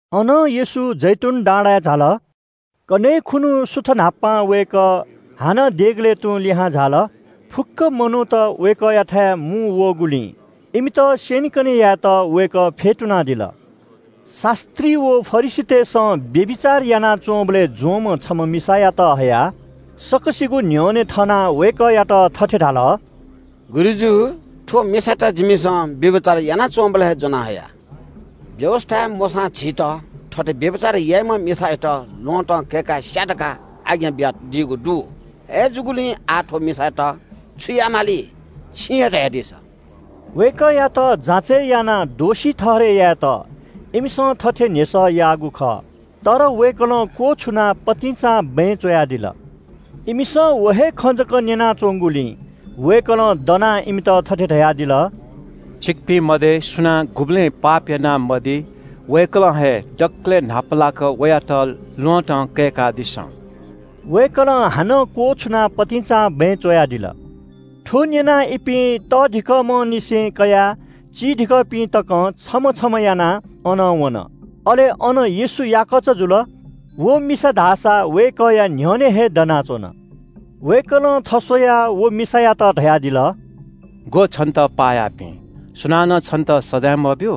अनं येशू जैतून डाँडाय् झाल। कन्‍हय् खुन्‍हु सुथ न्‍हापां वय्‌कः हानं देगलय् तुं लिहां झाल। फुक्‍क मनूत वय्‌कःयाथाय् मुंवःगुलिं इमित स्‍यनेकने यायेत वय्‌कः फ्‍यतुनादिल। शास्‍त्री व फरिसीतय्‌सं व्‍यभिचार यानाच्‍वंबलय् ज्‍वंम्‍ह छम्‍ह मिसायात हयाः सकसिगुं न्‍ह्यःने थनाः वय्‌कःयात थथे धाल – “गुरुजु, थ्‍व मिसायात जिमिसं व्‍यभिचार यानाच्‍वंबलय् ज्‍वना हया। व्‍यवस्‍थाय् मोशां झीत थथे व्‍यभिचार याइम्‍ह मिसायात ल्‍वहँतं कय्‌काः स्‍या धकाः आज्ञा बियादीगु दु। अय्‌जूगुलिं आः थ्‍व मिसायात छु याये माली? छिं हे धयादिसँ।” वय्‌कःयात जाँचय् यानाः दोषी ठहरय् यायेत इमिसं थथे न्‍ह्यसः याःगु खः। तर वय्‌कलं क्‍वछुनाः पतिंचां बँय् च्‍वयादिल। इमिसं व हे खँ जक न्‍यनाच्‍वंगुलिं वय्‌कलं दनाः इमित थथे धयादिल – “छिकपिं मध्‍ये सुनां गुबलें पाप यानामदी, वय्‌कलं हे दकलय् न्‍हापालाक वयात ल्‍वहँतं कय्‌कादिसँ।” वय्‌कलं हानं क्‍वछुनाः पतिंचां बँय् च्‍वयादिल। थ्‍व न्‍यनाः इपिं तःधिकःम्‍हंनिसें कयाः चीधिकःपिं तकं छम्‍ह छम्‍ह यानाः अनं वन। अले अन येशू याकःचा जुल। व मिसा धाःसा वय्‌कःया न्‍ह्यःने हे दनाच्‍वन। वय्‌कलं थस्‍वयाः व मिसायात धयादिल – “ग्‍वः, छन्‍त पाः याःपिं? सुनानं छन्‍त सजाँय मब्‍यू?”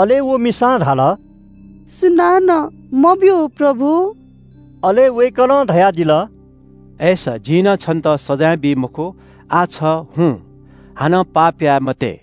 अले व मिसां धाल – “सुनानं मब्‍यू, प्रभु।” अले वय्‌कलं धयादिल – “अय्‌सा जिं नं छन्‍त सजाँय बी मखु, आः छ हुँ, हानं पाप याये मते।”]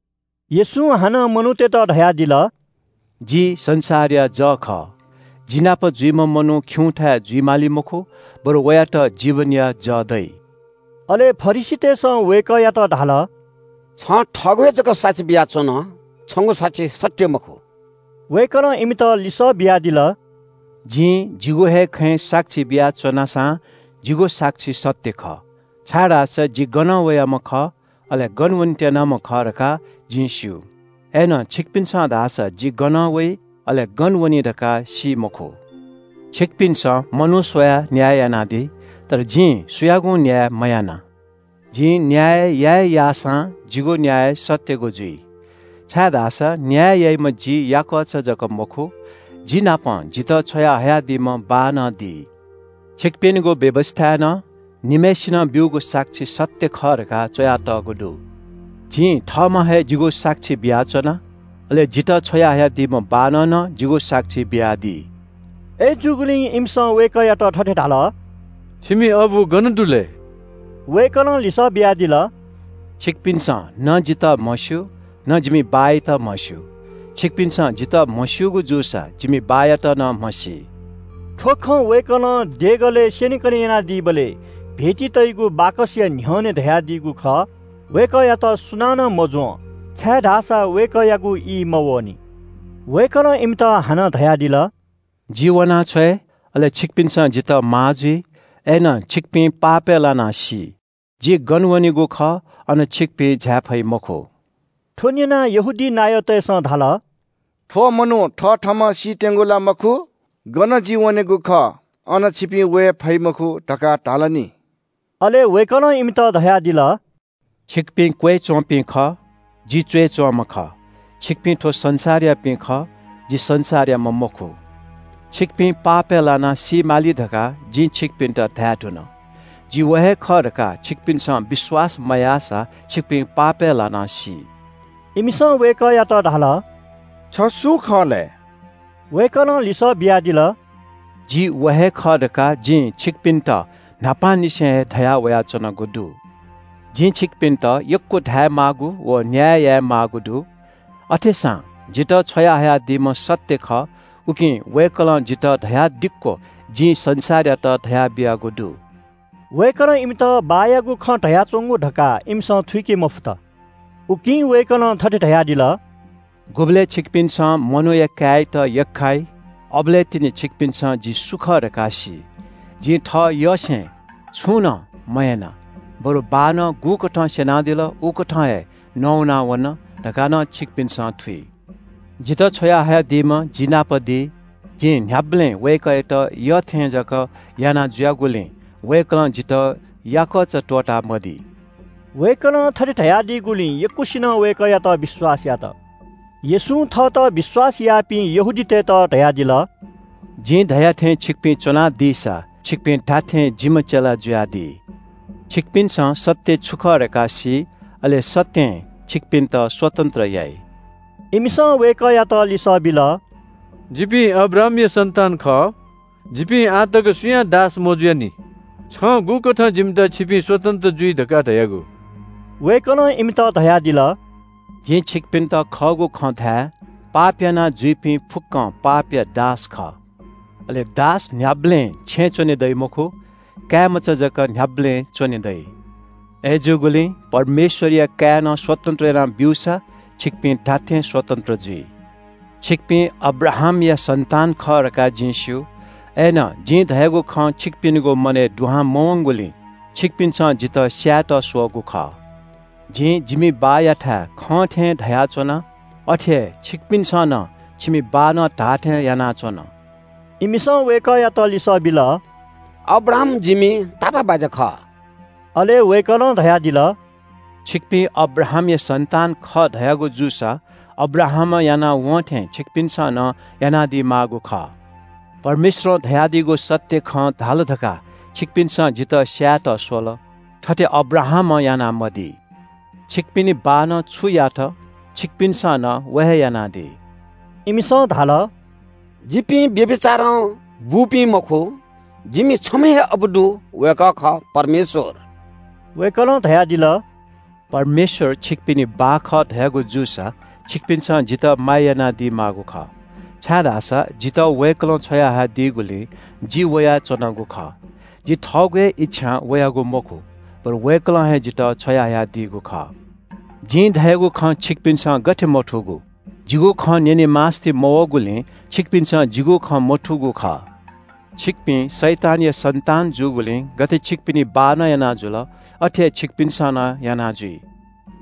येशूं हानं मनूतय्‌त धयादिल – “जि संसारया जः खः। जि नाप जुइम्‍ह मनू खिउँथाय् जुइ माली मखु, बरु वयात जीवनया जः दइ।” अले फरिसीतय्‌सं वय्‌कःयात धाल – “छं थःगु हे जक साक्षी बियाच्‍वन, छंगु साक्षी सत्‍य मखु।” वय्‌कलं इमित लिसः बियादिल – “जिं जिगु हे खँय् साक्षी बियाच्‍वना सां जिगु साक्षी सत्‍य खः, छाय्‌धाःसा जि गनं वयाम्‍ह खः, अले गन वने त्‍यनाम्‍ह खः धकाः जिं स्‍यू, अय्‌नं छिकपिन्‍सं धाःसा जि गनं वइ, अले गन वनी धकाः सी मखु। छिकपिन्‍सं मनू स्‍वयाः न्‍याय यानादी, तर जिं सुयागुं न्‍याय मयाना। जिं न्‍याय या हे याःसां जिगु न्‍याय सत्‍यगु जुइ, छाय्‌धाःसा न्‍याय याइम्‍ह जि याकःचा जक मखु, जिनापं जितः छ्वयाहयादीम्‍ह बाः नं दी। छिकपिनिगु व्‍यवस्‍थाय् नं निम्‍हय्‌सिनं ब्‍यूगु साक्षी सत्‍य खः धकाः च्‍वयातःगु दु। जिं थःम्‍हं हे जिगु साक्षी बियाच्‍वना, अले जितः छ्वयाहयादीम्‍ह बाःनं नं जिगु साक्षी बियादी।” अय्‌जूगुलिं इमिसं वय्‌कःयात थथे धाल – “छिमि बाः गन दु लय्?” वय्‌कलं लिसः बियादिल – “छिकपिन्‍सं न जितः म्‍हस्‍यू, न जिमि बाःयात म्‍हस्‍यू। छिकपिन्‍सं जितः म्‍हस्‍यूगु जूसा जिमि बाःयात नं म्‍हसी।” थ्‍व खँ वय्‌कलं देगलय् स्‍यनेकने यानादीबलय् भेटी तइगु बाकसया न्‍ह्यःने धयादीगु खः। वय्‌कःयात सुनानं मज्‍वं, छाय्‌धाःसा वय्‌कःयागु ई मवःनि। वय्‌कलं इमित हानं धयादिल – “जि वनाछ्वये, अले छिकपिन्‍सं जितः माः जुइ, अय्‌नं छिकपिं पापय् लानाः सी। जि गन वनेगु खः, अन छिकपिं झाये फइ मखु।” थ्‍व न्‍यनाः यहूदी नायःतय्‌सं धाल – “थ्‍व मनू थथःम्‍हं सीत्‍यंगु ला मखु? ‘गन जि वनेगु खः अन छिपिं वये फइ मखु’ धकाः धाल नि।” अले वय्‌कलं इमित धयादिल – “छिकपिं क्‍वय्‌च्‍वंपिं खः, जि च्‍वय्‌च्‍वंम्‍ह खः। छिकपिं थ्‍व संसारयापिं खः, जि संसारयाम्‍ह मखु। छिकपिं पापय् लानाः सी माली धकाः जिं छिकपिन्‍त धायेधुन। जि व हे खः धकाः छिकपिन्‍सं विश्‍वास मयाःसा छिकपिं पापय् लानाः सी।” इमिसं वय्‌कःयात धाल – “छ सु खः लय्?” वय्‌कलं लिसः बियादिल – “जि व हे खः धकाः जिं छिकपिन्‍त न्‍हापांनिसें हे धयावयाच्‍वनागु दु। जिं छिकपिन्‍त यक्‍व धायेमाःगु व न्‍याय यायेमाःगु दु। अथेसां जितः छ्वयाहयादीम्‍ह सत्‍य खः, उकिं वय्‌कलं जितः धयादिक्‍व जिं संसारयात धयाबियागु दु।” वय्‌कलं इमित बाःयागु खँ धयाच्‍वंगु धकाः इमिसं थुइके मफुत। उकिं वय्‌कलं थथे धयादिल – “गुबलय् छिमिसं मनूया काय्‌यात यख्‍खाइ, अबलय् तिनि छिमिसं जि सु खः धकाः सी। जिं थःयसें छुं नं मयाना, बरु बाःनं गुकथं स्‍यनादिल उकथं हे नवाना वन धकाः नं छिमिसं थुइ। जितः छ्वयाहयादीम्‍ह जि नाप दी, जिं न्‍ह्याबलें वय्‌कःयात यःथें जक यानाजुयागुलिं वय्‌कलं जितः याकःचा त्‍वःतामदी।” वय्‌कलं थथे धयादीगुलिं यक्‍वसिनं वय्‌कःयात विश्‍वास यात। येशूं थःत विश्‍वास याःपिं यहूदीतय्‌त धयादिल – “जिं धया थें छिपिं च्‍वंसा छिपिं धात्‍थें जिम्‍ह चेला जुइ। छिमिसं सत्‍य छु खः धकाः सी, अले सत्‍यं छिमित स्‍वतन्‍त्र याइ।” इमिसं वय्‌कःयात लिसः बिल – “जिपिं अब्राहामया सन्‍तान खः, जिपिं आः तक सुयां दास मजुयानि। छं गुकथं जिमित ‘छिपिं स्‍वतन्‍त्र जुइ’ धकाः धयागु?” वय्‌कलं इमित धयादिल – “जिं छिकपिन्‍त खःगु खँ धाये – पाप यानाजुइपिं फुक्‍कं पापया दास खः। अले दास न्‍ह्याबलें छेँय् च्‍वने दइ मखु, काय्‌मचा जक न्‍ह्याबलें च्‍वने दइ। अय्‌जूगुलिं परमेश्‍वरया काय्‌नं स्‍वतन्‍त्र याना ब्‍यूसा छिकपिं धात्‍थें स्‍वतन्‍त्र जुइ। छिकपिं अब्राहामया सन्‍तान खः धकाः जिं स्‍यू। अय्‌नं जिं धयागु खँ छिकपिनिगु मनय् दुहां मवंगुलिं छिकपिन्‍सं जितः स्‍यायेत स्‍वःगु खः। जिं जिमि बाःयाथाय् खं थें धयाच्‍वना, अथे हे छिकपिन्‍सं नं छिमि बाःनं धाःथें यानाच्‍वन।” इमिसं वय्‌कःयात लिसः बिल – “अब्राहाम जिमि तापाःबाज्‍या खः।” अले वय्‌कलं धयादिल – “छिकपिं अब्राहामया सन्‍तान खः धयागु जूसा अब्राहामं यानाः वं थें छिकपिन्‍सं नं यानादी माःगु खः। परमेश्‍वरं धयादीगु सत्‍य खँ धाल धकाः छिकपिन्‍सं जितः स्‍यायेत स्‍वल, थथे अब्राहामं यानामदी। छिकपिनि बाःनं छु यात छिकपिन्‍सं नं व हे यानादी।” इमिसं धाल – “जिपिं व्‍यभिचारं बूपिं मखु, जिमि छम्‍ह हे अबु दु, वय्‌कः खः परमेश्‍वर।” वय्‌कलं धयादिल – “परमेश्‍वर छिकपिनि बाः खः धयागु जूसा छिकपिन्‍सं जितः माया यानादी माःगु खः, छाय्‌धाःसा जितः वय्‌कलं छ्वया हयादीगुलिं जि वयाच्‍वनागु खः। जि थःगु हे इच्‍छां वयागु मखु, बरु वय्‌कलं हे जितः छ्वयाहयादीगु खः। जिं धयागु खँ छिकपिन्‍सं गथे मथूगु? जिगु खँ न्‍यने मास्‍ति मवःगुलिं छिकपिन्‍सं जिगु खँ मथूगु खः। छिकपिं शैतानया सन्‍तान जूगुलिं गथे छिकपिनि बाःनं याना जुल, अथे हे छिकपिन्‍सं नं याना जुइ।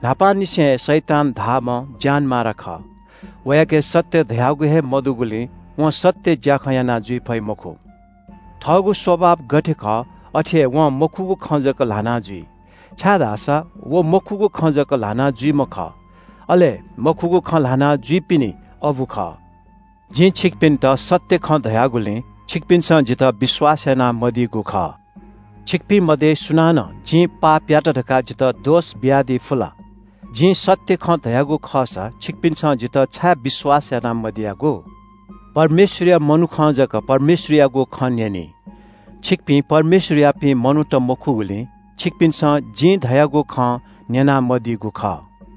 न्‍हापांनिसें हे शैतान धाःम्‍ह ज्‍यानमारा खः। वयाके सत्‍य धयागु हे मदुगुलिं वं सत्‍य ज्‍याखँ याना जुइ फइ मखु। थःगु स्‍वभाव गथे खः अथे हे वं मखुगु खँ जक ल्‍हाना जुइ, छाय्‌धाःसा व मखुगु खँ जक ल्‍हाना जुइम्‍ह खः, अले मखुगु खँ ल्‍हाना जुइपिनि अबु खः। जिं छिकपिन्‍त सत्‍य खँ धयागुलिं छिकपिन्‍सं जितः विश्‍वास यानामदीगु खः। छिकपिं मध्‍ये सुनानं जिं पापयात काः जितः दोष बियादी फु ला? जिं सत्‍य खँ धयागु खःसा छिकपिन्‍सं जितः छाय् विश्‍वास याना मदीयागु? परमेश्‍वरया मनुखं जक परमेश्‍वरयागु खँ न्‍यनी। छिकपिं परमेश्‍वरयापिं मनूत मखुगुलिं छिकपिन्‍सं जिं धयागु खँ न्‍यनामदीगु खः।”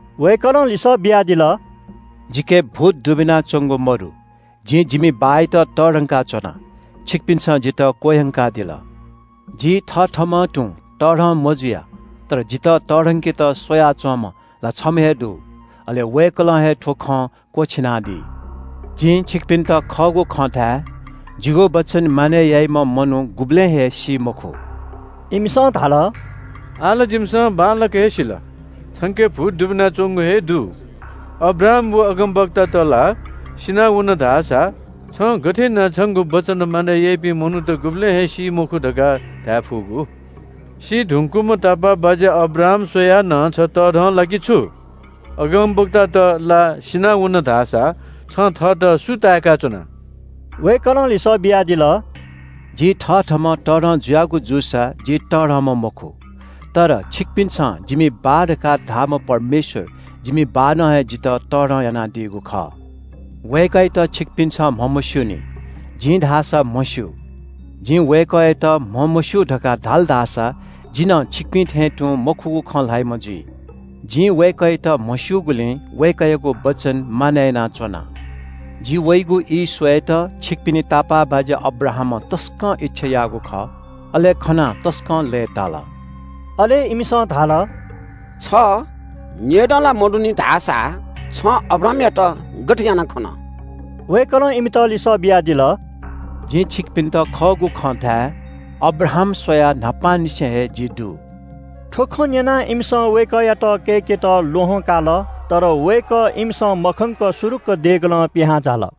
वय्‌कलं लिसः बियादिल – “जिके भूत दुबिनाच्‍वंगु मदु। जिं जिमि बाःयात तःधंका च्‍वना, छिकपिन्‍सं जितः क्‍वह्यंकादिल। जि थथःम्‍हं तुं तःधं मजुया, तर जितः तःधंकेत स्‍वया च्‍वंम्‍ह ला छम्‍ह हे दु। अले वय्‌कलं हे थ्‍व खँ क्‍वःछिनादी। जिं छिकपिन्‍त खःगु खँ धाये – जिगु वचन मानय् याइम्‍ह मनू गुबलें हे सी मखु।” इमिसं धाल – “आः ला जिमिसं बांलाक हे सिल, छंके भूत दुबिनाच्‍वंगु हे दु। अब्राहाम व अगमवक्तात ला सिनावन धाःसा छं गथे यानाः छंगु वचन मानय् याइपिं मनूत गुबलें हे सी मखु धकाः धाये फुगु? सी धुंकूम्‍ह तापाःबाज्‍या अब्राहाम स्‍वयाः नं छ तःधं ला कि छु? अगमवक्तात ला सिनावन धाःसा छं थःत सु ताय्‌का च्‍वना?” वय्‌कलं लिसः बियादिल – “जि थथःम्‍हं तःधं जुयागु जूसा जि तःधंम्‍ह मखु। तर छिकपिन्‍सं जिमि बाः धकाः धाःम्‍ह परमेश्‍वर जिमि बाःनं हे जितः तःधं यानादीगु खः। वय्‌कःयात छिकपिन्‍सं म्‍हमस्‍यूनि, जिं धाःसा म्‍हस्‍यू। जिं वय्‌कःयात म्‍हमस्‍यू धकाः धाल धाःसा जि नं छिकपिं थें तुं मखुगु खँ ल्‍हाइम्‍ह जुइ। जिं वय्‌कःयात म्‍हस्‍यूगुलिं वय्‌कःयागु वचन मानय् यानाच्‍वना। जि वइगु ई स्‍वयेत छिकपिनि तापाःबाज्‍या अब्राहामं तसकं इच्‍छा याःगु खः, अले खनाः तसकं लय्‌ताल।” अले इमिसं धाल – “छ नेय्‌दँ ला मदुनि धाःसा छं अब्राहामयात गथे यानाः खन?” वय्‌कलं इमित लिसः बियादिल – “जिं छिकपिन्‍त खःगु खँ धाये – अब्राहाम स्‍वयाः न्‍हापांनिसें हे जि दु।” थ्‍व खँ न्‍यनाः इमिसं वय्‌कःयात कय्‌केत ल्‍वहं काल। तर वय्‌कः इमिसं मखंक सुरुक्‍क देगलं पिहां झाल।